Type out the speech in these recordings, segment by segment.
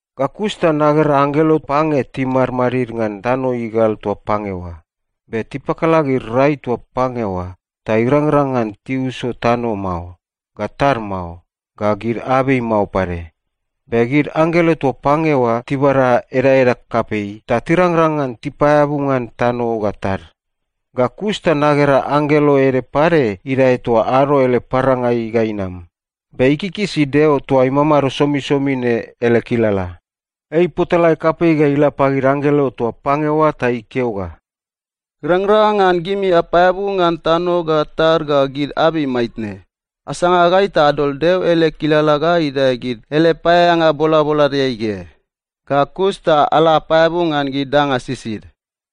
Ga kus ta nagera anggelo pange timadmadid ngan tano igal toa pange oa, be tipakala gid rai toa pange oa ta irangrang ngan tiuso tano mao, ga tad mao, ga gid abei mao pade. Be gid anggelo toa pange oa tibada edaeda kapei ta tirangrang ngan tipaeabu ngan tano ga tad. Ga kus ta nagera anggelo ede pade idae toa ado ele parangai ga inam, be ikikisi Deo toa imamado somisomi ne ele kilala. Ei ipotalae kapei ga ila pagid anggelo toa pange oa ta ikeo ga, “Irangrang ngan gimi apaeabu ngan tano ga tad ga gid abei maitne. Asanga gai ta adol Deo ele kilala ga idae gid ele paeaeanga bolaboladeai ge. Ga kus ta ala apaeabu ngan gid danga sisid.”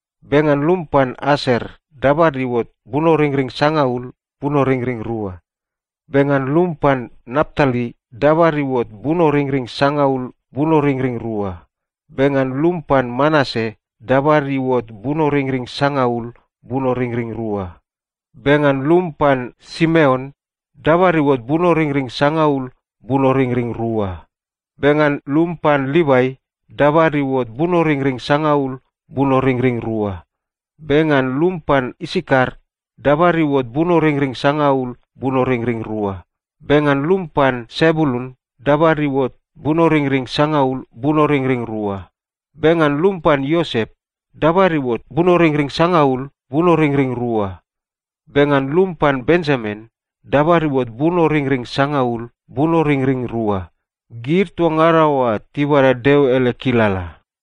Be ngan lum pan Aser, dabad iuot bunoringring sangaul, bunoringring rua. Be ngan lum pan Naptali, dabad iuot bunoringring sangaul, bunoringring rua. Be ngan lum pan Manase, dabad iuot bunoringring sangaul, bunoringring rua. Be ngan lum pan Simeon, dabad iuot bunoringring sangaul, bunoringring rua. Be ngan lum pan Livai, dabad iuot bunoringring sangaul, bunoringring rua. Be ngan lum pan Isakar, dabad iuot bunoringring sangaul, bunoringring rua. Be ngan lum pan Sebulun, dabad iuot bunoringring sangaul, bunoringring rua. Be ngan lum pan Iosep, dabad iuot bunoringring sangaul, bunoringring rua. Be ngan lum pan Benjamin, dabad iuot bunoringring sangaul, bunoringring rua. Gid toa ngada oa tibada Deo ele kilala.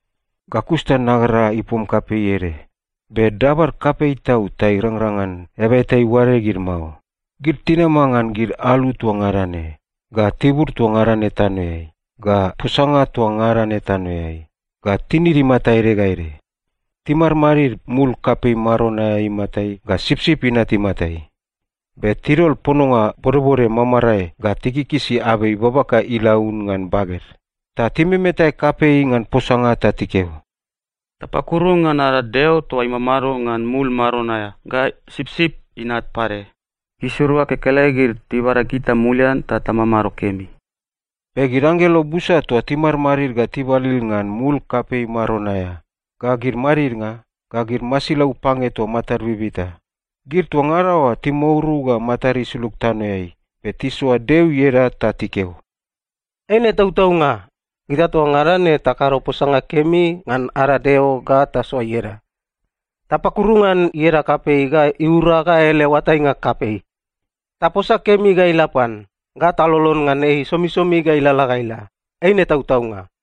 Ga kus ta nagera ipom kapei ede. Be dabad kapei tau ta irangrang ngan eaba eta iuade gid mao. Gid tinama ngan gid alu toa ngada ne, ga tibur toa ngada ne tanoeai, ga posanga toa ngada ne tanoeai, ga tinid imata ede ga ede. Timadmadid mul kapei maron aea imatai ga Sipsip Inat imatai. Be tidol pononga bodbode mamarae ga tikikisi abei babaka ilaun ngan baged. Ta timemetae kapei ngan posanga ta tikeo, “Tapakuru ngan ada Deo toa imamado ngan mul maron aea ga Sipsip Inat pade! Gisirua kekelegid tibada gita mulian ta tamamado kemi.” Be gid anggelo busa toa timadmadid ga tibalil ngan mul kapei maron aea, ga gid madidnga, ga gid masilau pange toa matad bibita, gid toa ngada oa timouru ga matad isulug tanoeai, be tisoa Deo ieda ta tikeo, “Eine tautaunga! Gita toa ngada ne takado posanga kemi ngan ada Deo ga tasoa ieda. Tapakuru ngan ieda kapei ga iura ga ele oatainga kapei. Taposa kemi ga ila pan, ga talolon ngan ei somisomi ga ilalala ga ila. Eine tautaunga!”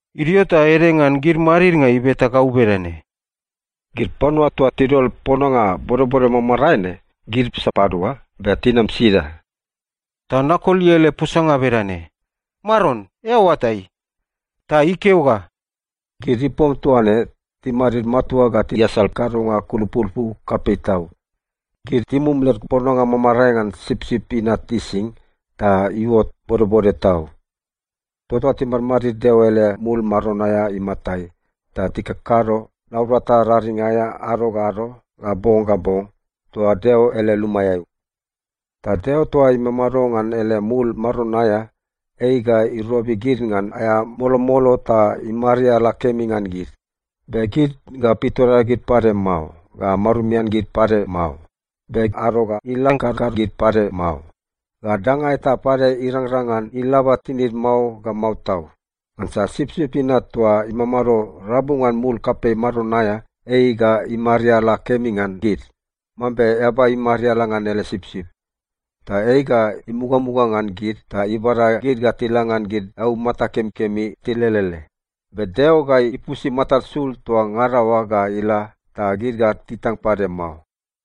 Idio ta ede ngan gid madidnga ibeta gau bedane, “Gid panua toa tidol pononga bodbode mamarae ne, gid sapadua, be tinam sida?” Ta nakoli ele posanga bedane, “Maron, eao oatai.” Ta ikeo ga, “Gid ipom toa ne timadid matua ga tiasal kadonga kulupulupu kapei tau. Gid timum led pononga mamarae ngan Sipsip Inat ising, ta iuot bodbode tau. “Tota timadmadid Deo ele mul maron aea imatai ta tikakado naurata raring aea ado ga ado ga bong ga bong toa Deo ele lumaeai. Ta Deo toa imamado ngan ele mul maron aea, ei ga irobi gid ngan aea molomolo ta imariala kemi ngan gid. Be gid ga pitoreagid pade mao, ga marumian gid pade mao. Be ado ga ilang karkar gid pade mao, ga danga eta pade irangrang ngan ilaba tinid mao ga mao tau. Ngansa Sipsip Inat toa imamado rabu ngan mul kapei maron aea, ei ga imariala kemi ngan gid mambe eaba imariala ngan ele sipsip. Ta ei ga imugamuga ngan gid ta ibada gid ga tila ngan gid eaumata kemikemi tilelele. Be Deo ga ipusi matad sul toa ngada oa ga ila, ta gid ga titang pade mao.”